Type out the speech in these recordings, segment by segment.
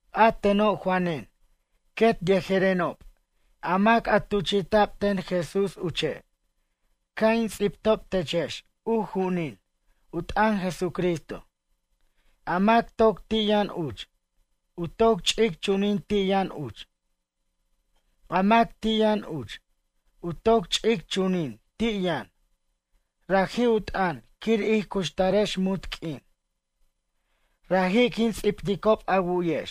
A teno' Juanen quet yejerenob a mac a tuchi'ta'b ten Jesús uche' ca' in ts'ibtob techex u ju'unin u t'ʌn Jesucristo, a mac toc ti' yʌn uch, u toc ch'ic chunin ti' yʌn uch. A mac ti' yʌn uch, u toc ch'ic chunin ti' yʌn, raji' u t'ʌn quir ij cuxtarex munt q'uin. Raji' quin ts'ibticob a wu'yex,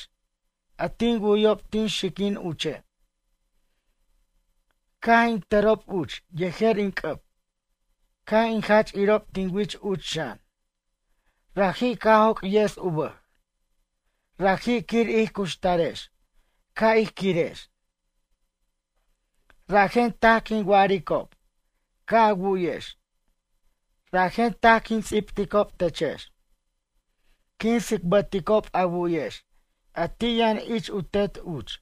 a tin wu'yob tin xiquin uche'. Caj in tʌrob uch yejer in c'ʌb. Caj in jach irob tin wich uch xan. Raji' caj joc' yes u bʌj, raji' quir ij cuxtarex caj ij quirex. Rajen taj quin wa'aricob ca' a wu'yex. Rajen taj quin ts'ibticob techex. Quin tsicbʌticob a wu'yex a ti' yʌn ich u Tet uch,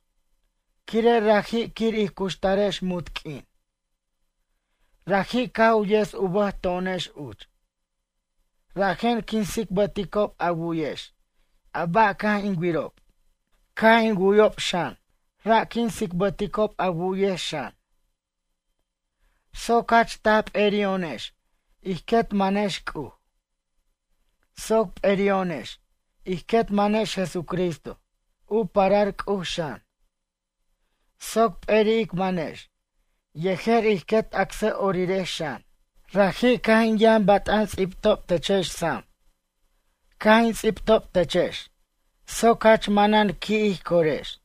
quire' raji' quir ij cuxtarex munt q'uin. Raji' caj u yes u bʌj to'onex uch. Rajen quin tsicbʌticob a wu'yex a ba' caj in wirob. Caj in wu'yob xan, ra' quin tsicbʌticob a wu'yex xan. Soc jach taj p'eri'o'onex ij quet manex C'uj. Soc p'eri'o'onex ij quet manex Jesucristo u parar C'uj xan. Soc p'eri' ic manex yejer ij quet acsʌ'orirex xan. Raji' caj in yʌn bat'an ts'ibtob techex sam. Caj in ts'ibtob techex soc jach manan qui' ij corex.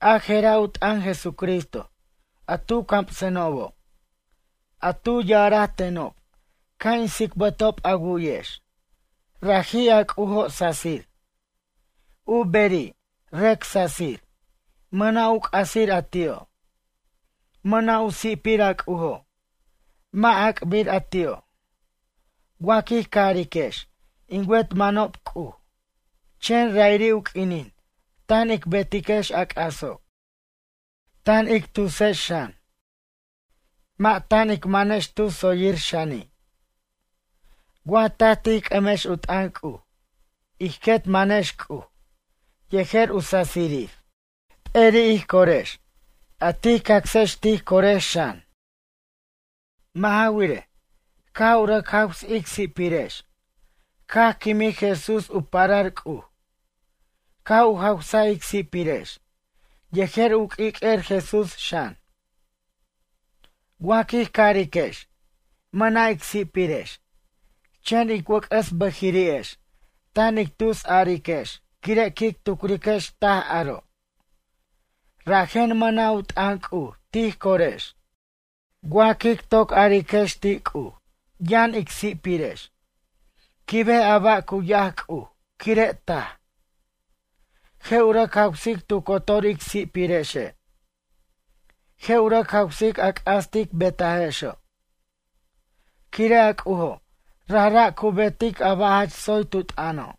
A je'ra' u t'ʌn Jesucristo a tu camsenobo'. A tu ya'araj tenob ca' in tsicbʌtob a wu'yex, raji' a C'ujo' sasir. U beri', rʌc sasir, mʌna' u c'asir a ti'o'. Mʌna' u si'pir a C'ujo', mʌ' ac'bir a ti'o'. Wa quij cariquex in wet mʌnob C'uj, chen ra'iri' u q'uinin tan ic betiquex a c'aso'. Tan ic tusex xan. Mʌ' tan ic manex tu tsoyir xani'. Wa taj tij c'ʌmex u t'ʌn C'uj, ij quet manex C'uj yejer u sasirir. P'eri' ij corex, a tij cacsex tij corex xan. Mʌ' ja wirej, caj u rʌc jaws ic si'pirex, caj quimij Jesús u parar C'uj. Caj u jawsa ic si'pirex yejer u q'uiq'uer Jesús xan. Wa quij cariquex: “Mʌna' ic si'pirex”, chen ic wʌc'ʌs bʌjiri'ex tan ic tusariquex quire' quic tucriquex taj aro'. Rajen mʌna' u t'ʌn C'uj tij corex. Wa quic toc ariquex ti' C'uj: “Yʌn ic si'pirex”, quibej a ba' cu yac C'uj quire' taj. Je' u rʌc jawsic tu cotor ic si'pirexe'. Je' u rʌc jawsic a c'as tic betajexo'. Quire' a C'ujo' rajra' cu betic a ba' jach tsoy tu t'ʌno'.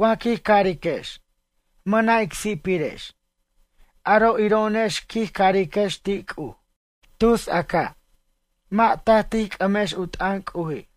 Wa quij cariquex: “Mʌna' ic si'pirex”, aro' iro'onex quij cariquex ti' C'uj: “Tus a ca'.” Mʌ' taj tij c'ʌmex u t'ʌn C'uji'.